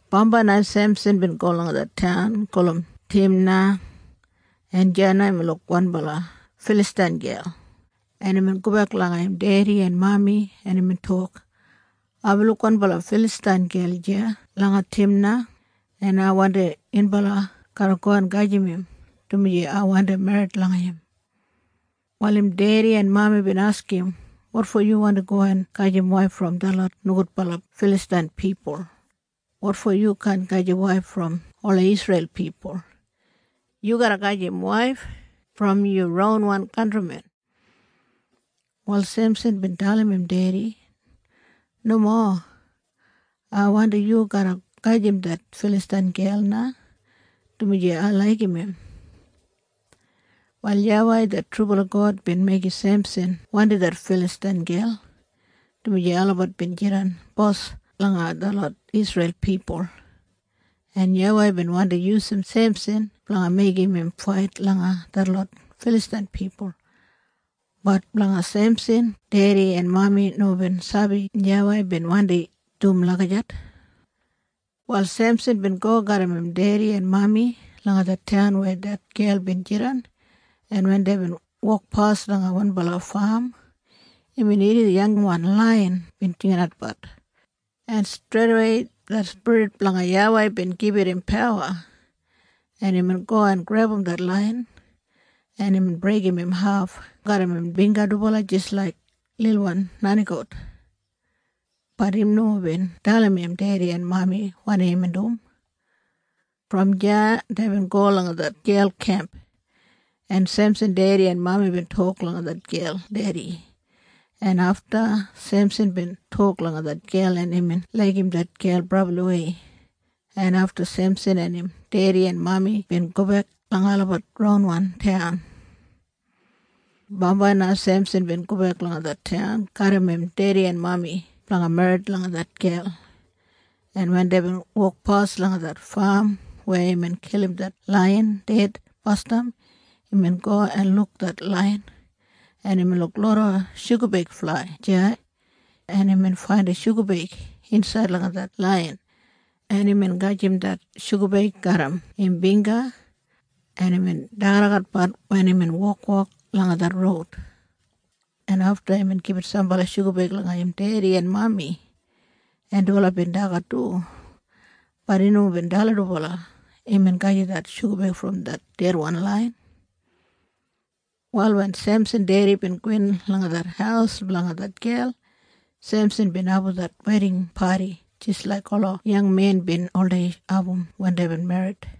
Bambai na Semsan bin go langa det taun gulum Timna, en deya na imbin luk wanbala Filastain gel, en imbin gobek langa im dedi en mami, en imbin tok, “Aibin luk wanbala Filastain gel deya langa Timna, en ai wandim yunbala garra go en gajim im, dumaji ai wandi merrit langa im.” Wal im dedi en mami bin askim im, “Wotfo yu wandi go en gajim waif brom detlot nogudbala Filastain pipul? Wotfo yu kaan gajim waif brom ola Isreil pipul? Yu garra gajim waif brom yu ronwan kantrimen.” Wal Semsan bin dalim im dedi, “Nomo. Ai wandim yu garra gajim det Filastain gel na, dumaji ai laigim im.” Wal YAWEI det trubala God bin meigim Semsan wandim det Filastain gel, dumaji olabat bin jidan bos langa detlot Isreil pipul, en YAWEI bin wandi yusum Semsan blanga meigim im fait langa detlot Filastain pipul. Bat blanga Semsan dedi en mami nomo bin sabi YAWEI bin wandi dum lagijat. Wal Semsan bin go garram im dedi en mami langa det taun weya det gel bin jidan, en wen deibin wokpas langa wanbala fam, imbin irrim yangwan laiyan bin jingatbat, en streidawei det spirit blanga YAWEI bin gibit im pawa, en imbin go en grebum det laiyan, en imbin breigim im haf garram im bingga dubala jis laik lilwan nenigout. Bat im nomo bin dalim im dedi en mami wanim imbin dum. Brom deya deibin go langa det gel kemp, en Semsan dedi en mami bin tok langa det gel dedi, en afta Semsan bin tok langa det gel, en imbin laigim det gel brabliwei, en afta Semsan en im dedi en mami bin gobek langa olabat ronwan taun. Bambai na Semsan bin gobek langa det taun garram im dedi en mami blanga merrit langa det gel, en wen deibin wokpas langa det fam weya imbin kilim det laiyan ded basdam, imbin go en luk det laiyan, en imbin luk loda shugabeig flai deya, en imbin faindim shugabeig insaid langa det laiyan, en imbin gajim det shugabeig garram im bingga, en imbin dagadagat wen imbin wokwok langa det roud, en afta imbin gibit sambala shugabeig langa im dedi en mami, en dubala bin dagat du. Bat im nomo bin dalim dubala imbin gajim det shugabeig brom det dedwan laiyan. Wal wen Semsan dedi bin gowin langa det haus blanga det gel, Semsan bin abum det weding padi jis laik ola yangmen bin oldei abum wen deibin merrit,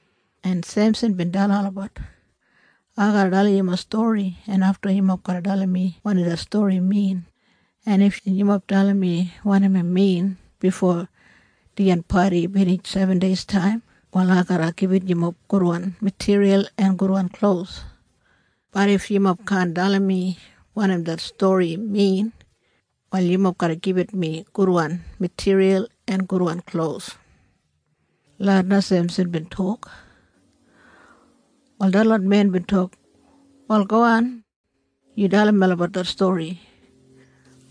en Semsan bin dalim olabat, “Ai garra dalim yumob stori, en afta yumob garra dalim mi wanim det stori min, en if yumob dalim mi wanim im min bifo dijan padi binij sebendeistaim, wal ai garra gibit yumob gudwan matiriyal en gudwan klos. Bat if yumob kaan dalim mi wanim det stori min, wal yumob garra gibit mi gudwan matiriyal en gudwan klos.” Lagijat na Semsan bin tok. Wal detlot men bin tok, “Wal gowan. Yu dalim melabat det stori.”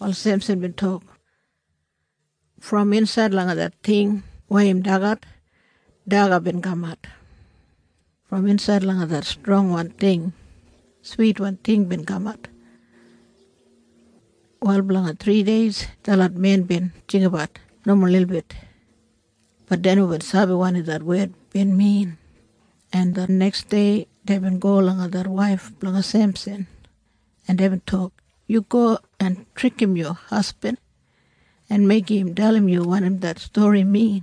Wal Semsan bin tok, “Brom insaid langa det ting weya im dagat, daga bin kamat. Brom insaid langa det strongwan ting, switwan ting bin kamat.” Wal blanga thrideis detlot men bin jinggabat nomo lilbit. Bat dei nomo bin sabi wanim det wed bin min, en det neksdei deibin go langa det waif blanga Semsan, en deibin tok, “Yu go en trikim yu hasbin en meigim im dalim yu wanim det stori min.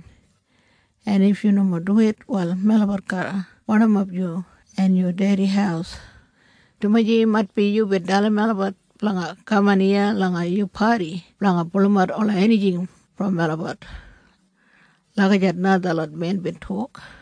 En if yu nomo duwit, wal melabat garra barnimap yu en yu dedi haus, dumaji maitbi yubin dalim melabat blanga kaman iya langa yu padi blanga pulumat ola enijing brom melabat.” Lagijat na detlot men bin tok.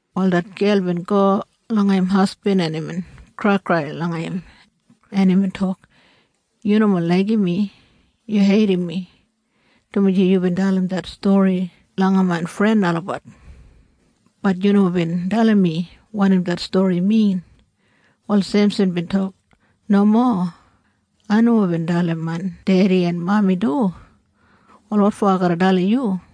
Wal det gel bin go langa im hasbin, en imbin kraikrai langa im, en imbin tok, “Yu nomo laigim mi. Yu heidim mi, dumaji yubin dalim det stori langa main fren olabat. Bat yu nomo bin dalim mi wanim det stori min.” Wal Semsan bin tok, “Nomo. Ai nomo bin dalim main dedi en mami du. Wal wotfo ai garra dalim yu?”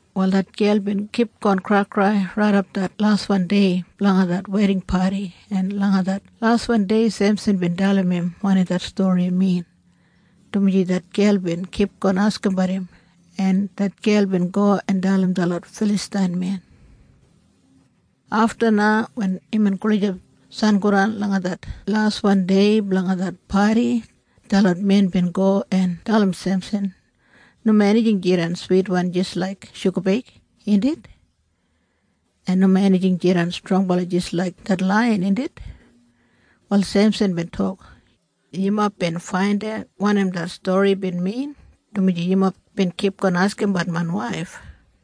Wal det gel bin kipgon kraikrai raidap det laswan dei blanga det weding padi, en langa det laswan dei Semsan bin dalim im wanim det stori min, dumaji det gel bin kipgon askimbat im, en det gel bin go en dalim detlot Filastain men. Afta na wen imbin gulijap sangodan langa det laswan dei blanga det padi, detlot men bin go en dalim Semsan, “Nomo enijing jidan switwan jis laik shugabeig, indit? En nomo enijing jidan strongwan jis laik det laiyan, indit?” Wal Semsan bin tok, “Yumob bin faindat wanim det stori bin min, dumaji yumob bin kipgon askimbat main waif.”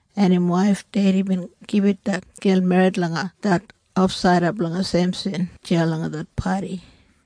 en im waif dedi bin gibit det gel merrit langa det ofsaida blanga Semsan deya langa det padi.